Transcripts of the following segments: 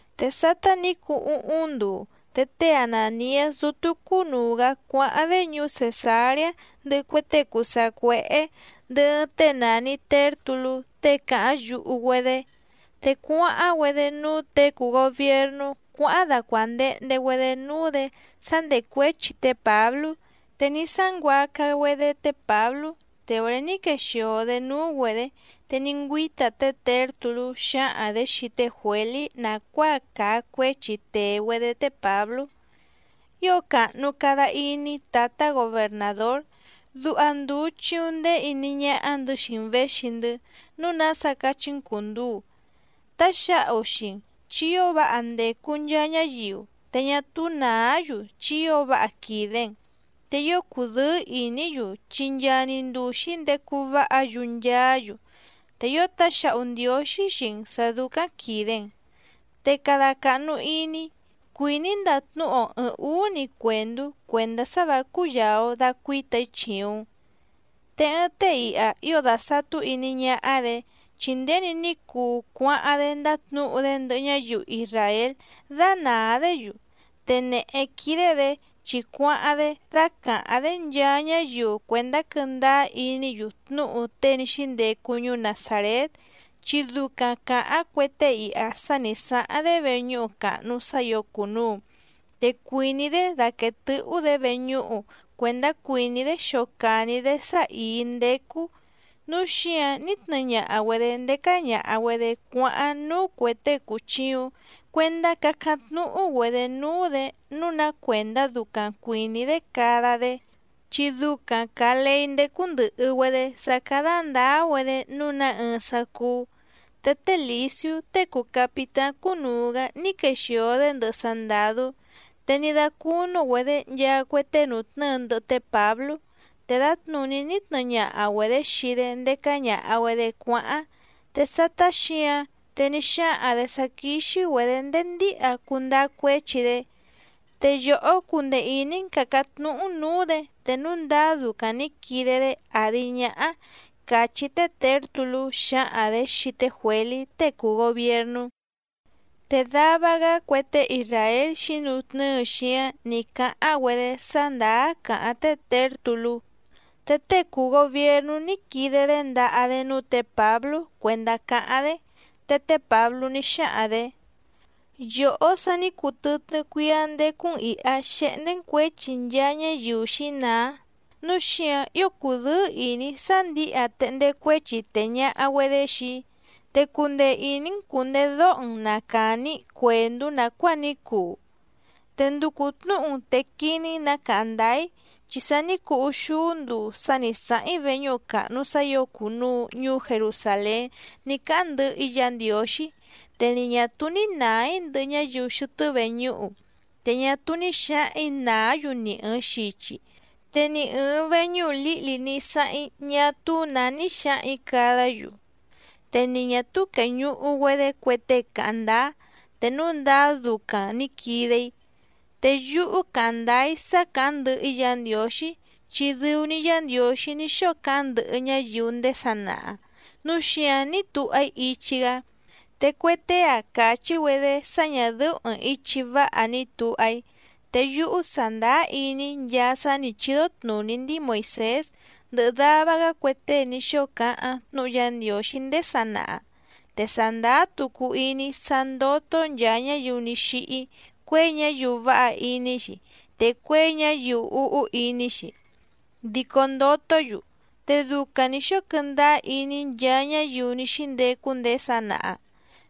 Te sátá nǐ cuu úhúⁿ nduu, te té Anàniás dútú cúnùu‑gá cuáháⁿ‑dé ñuú Cèsareá ndɨhɨ cue tée cùu sacuéhé ndɨhɨ ɨɨⁿ tée nàni Tértulú tée càháⁿ yuhu‑güedé. Te cuáháⁿ‑güedé núú těe cùu gobiernú cuáháⁿ dácuándèhnde‑güedé núú‑dě sá ndècuéchi té Pǎblú. Te ní sánguaca‑güedé té Pǎblú. Te òré ní quexìo‑dé núú‑güedě, te ní ngüíta té Těrtulú xǎhaⁿ‑dě xii té Juělí nàcuáa càa cuéchi tèe‑güedé té Pǎblú: —Ío càhnu cada iní tǎtá gobernàdór. Duha ndùu chiuⁿ ndéé iní ñáhá‑ndɨ̌ xii‑n věxi‑ndɨ́, núu nása cachí‑n cùnduu. Táxǎhu xii‑n, chi ío váha ndècu nchaa ñáyiu, te ñá túú nàá‑yu chi ío váha quìde‑n. Te ío cùdɨ́ɨ́ ìní‑yu chi nchaa‑ni nduu xǐndecu váha‑yu nchaá‑yu, te ío táxǎhu Ndiǒxí xii‑n sǎ dúcáⁿ quìde‑n. Te cada càhnu iní, cuìní‑í ndatnúhu‑o ɨ̀ɨⁿ úú‑ni cuèndú cuèndá sá vǎ cúyàa‑o dacuíta‑í chìuⁿ‑n. Te ɨɨⁿ tée iha ío dàsatú iní ñáhá‑dě, chi nděni ní cuu cuáháⁿ‑dé ndátnǔhu‑dé ndɨhɨ ñáyiu isràél dánàá‑dé‑yu. Te nèhé quídé‑dě chi cuáháⁿ‑dé dácàháⁿ‑dé nchaa ñáyiu cuèndá quɨ́ndáá iní‑yu tnúhu tée ní xíndecu ñuú Nazàrét. Chi ducaⁿ càháⁿ cue tée iha sá nǐ sáháⁿ‑dé veñúhu càhnu sá ǐo cùnuu, te cuìní‑dé daquèe tɨ́hú‑dě veñúhu cuèndá cuìní‑dé xocàni‑dé sá ìí ndécú, núu xíǎⁿ ní tnɨɨ ñaha‑güedě ndécá ñàha‑güedé cuáháⁿ núú cuè tée cùchiuⁿ cuendá cácáⁿ tnúhú‑güedě núú‑dě nǔu ná cuèndá ducaⁿ cuìní‑dé cada‑dé, chi ducaⁿ càa leí ndécú ndɨ̀hɨ‑güedé sá cádá ndǎá‑güedé nǔu ná ɨɨⁿ sá cúú. Te té Lìsiú tée cùu capitáⁿ cúnùu‑gá ní quexìo‑dé ndɨhɨ sandàdú, te ní dácúnú‑güedě nchaa cue tée nùtnɨ́ɨ ndɨhɨ té Pǎblú, te dǎtnùní ní tnɨɨ ñaha‑güedě xii‑dé ndécá ñàha‑güedé cuáháⁿ. Te sátá xǐǎⁿ, te ní xáhaⁿ‑dě sá quíxí‑güedě ndéé ndíha cundáá cuéchi‑dé. Te yòhó cundee ìní‑n càcáⁿ tnúhú‑n nǔú‑dě, te núu ndáá ducaⁿ nǐ quide‑dé àdi ñáhá —càchí té Těrtulú xǎhaⁿ‑dě xii té Juělí tée cùu gobiernú. Te dava‑gá cue tée isràél xǐnutnɨ́ɨ xíáⁿ nǐ cáháⁿ‑güedé sá ndàá càháⁿ té Těrtulú. Te tée cùu gobiernú ní quide‑dé ndaha‑dé núú tě Pǎblú cuèndá cáháⁿ‑dé, te té Pǎblú ní xáhaⁿ‑dě: —Yòhó sa ní cuu tɨtnɨ́ cuíá ndécú‑n ìha xehndé‑n cuěchi nchaa ñáyiu xǐnàá, núu xíǎⁿ ío cùdɨ́ɨ́ ìní‑í sá ndǐha téhndé cuéchi tèe ñaha‑güedé xii‑í. Te cundee ìní‑n cùndedóho‑n na càni‑í cuèndú nàcuáa ní cuu. Te nducu tnǔhu‑n te quiní‑n nǎ càháⁿ ndáá‑í, chi sa ní cuu úxúú nduu sá nǐ sáháⁿ‑í veñúhu càhnu sá ǐo cùnuu ñuú Jerusàlén ní cáháⁿ ndɨhɨ‑í Yǎ Ndiǒxí. Te ni ñà túú ní nàá‑í ndɨhɨ ñáyiu xɨtɨ́ veñúhu, te ñá túú ní xǎhaⁿ‑ǐ nàá‑yu ni ɨ̀ɨⁿ xichi, te ni ɨ̀ɨⁿ veñúhu lǐhli ní sáháⁿ‑í ñá túú nǎ ní xǎhaⁿ‑ǐ cadá‑yu. Te ni ñà túú quèñuhu‑güedé cue tée cáháⁿ ndáá te núu ndáá ducaⁿ nǐ quide‑í. Te yúhú càháⁿ ndáá‑í sá càháⁿ ndɨhɨ‑í Yǎ Ndiǒxí, chi dɨu‑ni Yá Ndiǒxí ní xóo cáháⁿ ndɨhɨ ñáyiu ndéé sanaha, núu xíǎⁿ ní tuha‑í ichi‑gá. Te cue tée‑a càchí‑güedé sá ñà dɨ́ú ɨ̀ɨⁿ ichi váha ni tuha‑í. Te yúhú sàndáá iní‑í nchaa sá nǐ chídó tnùní ndíi Moìsés ndɨhɨ dava‑gá cue tée ní xóo cáháⁿ tnúhu Yá Ndiǒxí ndéé sanaha. Te sàndáá tucu iní‑í sá ndótó nchàa ñáyiu ní xíhí, cuěi ñáyiu váha iní‑xi, te cuěi ñáyiu úhú iní‑xi, dico ndotó‑yu. Te ducaⁿ nǐ xóo quɨndáá iní nchaa ñáyiu ní xíndecu ndéé sanaha.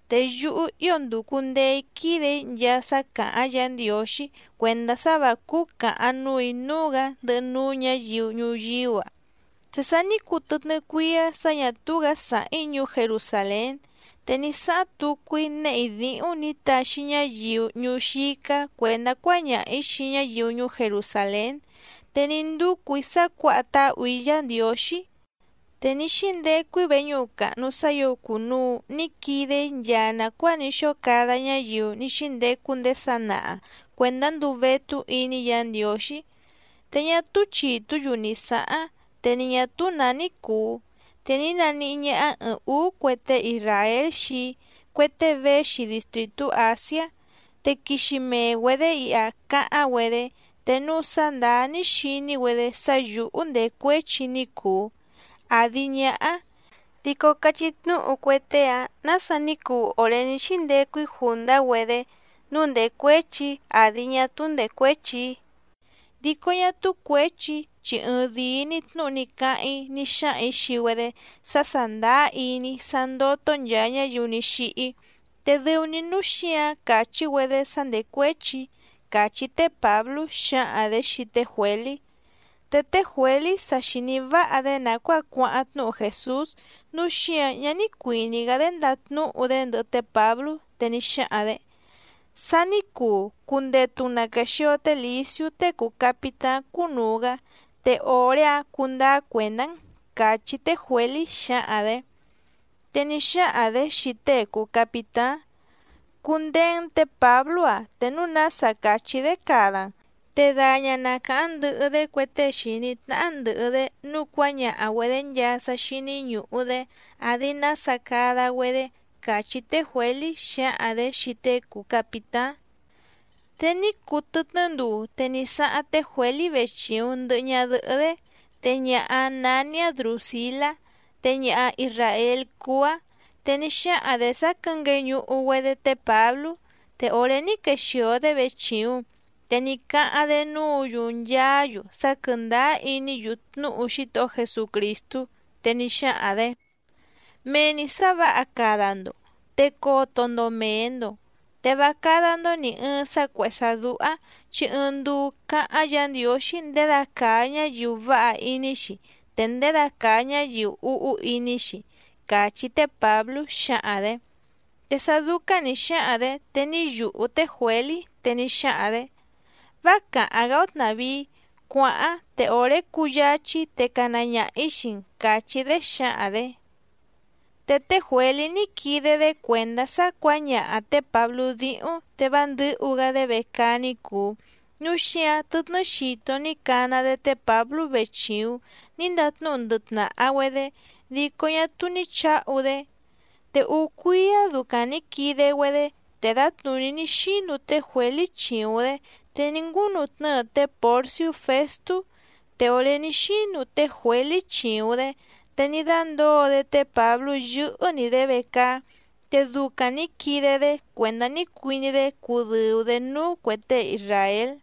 Te yúhú ío ndùcu ndee‑í quídè‑í nchaa sá càháⁿ Yǎ Ndiǒxí cuèndá sá vǎ cúú càhaⁿ núù‑í núú‑gǎ ndɨhɨ núú ñǎyiu ñuyíú‑a. ’Te sa ní cuu tɨtnɨ́ cuíá sǎ ñà túú‑gǎ sàháⁿ‑í ñuú Jerusàlén, te ní sáháⁿ tucu‑í néhè‑í díhúⁿ nǐ taxi ñáyiu ñuú xícá cuèndá cuáñaha‑ǐ xii ñáyiu ñuú Jerusàlén. Te ní ndúcù‑í sá cuǎha táhù‑í Yǎ Ndiǒxí. Te ní xíndecu‑í veñúhu càhnu sá ǐo cùnuu ní quide‑í nchaa nàcuáa ní xóo cada ñáyiu ní xíndecu ndéé sanaha cuèndá nduu vétú iní Yǎ Ndiǒxí. Te ñá túú chìtú‑yu ni sǎháⁿ, te ni ñà túú nǎ ní cùu, te ní naníhí ñáhá ɨ̀ɨⁿ úú cue tée isràél xii‑í, cue tée véxi distrìtú Àsiá. Te quixi mee‑güedě iha cáháⁿ‑güedé, te núu sá ndàá ní xini‑güedé sá yǔhú ndècuéchi‑í ní cùu, àdi ñáhá. Dico cachí tnúhu cue tée‑áⁿ nǎsa ní cuu òré ní xíndecu‑í jùndá‑güedé nǔu ndècuéchi‑í àdi ñá túú ndècuéchi‑í. Dico ñá túú cuěchi‑í chi ɨɨⁿdìi‑ni tnúhu ni cáháⁿ‑í ní xáhaⁿ‑ǐ xii‑güedé sá sàndáá iní‑í sá ndótó nchàa ñáyiu ní xíhí, te dɨu‑ni núu xíǎⁿ càchí‑güedé sá ndècuéchi‑í —càchí té Pǎblú xǎhaⁿ‑dě xii té Juělí. Te té Juělí sa xìní váha‑dé nàcuáa cuáháⁿ tnúhu Jèsús, núu xíǎⁿ ñá ní cuìní‑gá‑dé ndatnúhu‑dé ndɨhɨ té Pǎblú, te ní xáhaⁿ‑dě: —Sa ní cuu, cundetu‑n na quèxio té Lìsiú tée cùu capitáⁿ cúnùu‑gá, te òré‑áⁿ cundáá cuèndá‑n —càchí té Juělí xǎhaⁿ‑dě. Te ní xáhaⁿ‑dě xii tée cùu capitáⁿ: —Cundeé‑n tě Pǎblú‑ǎⁿ, te núu nása càchí‑dé cada‑n, te daña‑n na càháⁿ ndɨhɨ‑dé cue tée xìní tnáhá ndɨ̀hɨ‑dé nǔu cuáñaha‑güedě nchaa sá xíní ñùhu‑dé àdi nása cada‑güedé —càchí té Juělí xǎhaⁿ‑dě xii tée cùu capitáⁿ. Te ní cuu tɨtnɨ́ nduu, te ní sáháⁿ té Juělí vechìuⁿ ndɨhɨ ñadɨhɨ́‑dé, te ñaha‑áⁿ nání‑áⁿ Drùsilá, te ñaha isràél cúú‑áⁿ. Te ní xáhaⁿ‑dě sá quɨ̌ngueñuhu‑güedé té Pǎblú, te òré ní quexìo‑dé vechìuⁿ, te ní cáháⁿ‑dé núǔ‑yu nchaá‑yu sá quɨ̀ndáá iní‑yu tnúhu Xítohó Jesucrìstú. Te ní xáhaⁿ‑dě: —Mee‑ni sǎ vǎha cada‑ndo. Te coto‑ndo mèe‑ndo, te vá cádá‑ndó nì ɨɨⁿ sá cuèhé sá dúhá, chi ɨɨⁿ nduu cáháⁿ Yǎ Ndiǒxí ndědacàa ñáyiu váha iní‑xi, te ndědacàa ñáyiu úhú iní‑xi —càchí té Pǎblú xǎhaⁿ‑dě. Te sá dúcáⁿ nǐ xáhaⁿ‑dě, te ní yùhú té Juělí, te ní xáhaⁿ‑dě: —Vá càháⁿ‑gá‑ó tnàvíí, cuàháⁿ, te òré cúyǎchí‑í, te cana ñaha‑ǐ xii‑n —càchí‑dé xǎhaⁿ‑dě. Te té Juělí ní quide‑dé cuèndá sá cuǎñaha tě Pǎblú díhúⁿ te vá ndɨ̌hu‑gá‑dé vecaá ní cùu, núu xíǎⁿ tɨtnɨ́ xito ní cana‑dé té Pǎblú vechìuⁿ ní ndatnúhu ndɨhɨ tnàha‑güedé, dico ñá túú ní chǎhu‑dé. Te úú cuíá ducaⁿ nǐ quide‑güedé, te dǎtnùní ní xínu té Juělí chìuⁿ‑dé, te ní ngúnutnɨ́ɨ té Pòrsiú Fèstú. Te òré ní xínu té Juělí chìuⁿ‑dé, te ní dándǒo‑dé té Pǎblú yɨ́hɨ́‑ni‑dě vecaá. Te ducaⁿ nǐ quide‑dé cuèndá ní cuiní‑dé cudɨ̀u‑dé núú cuè tée isràél.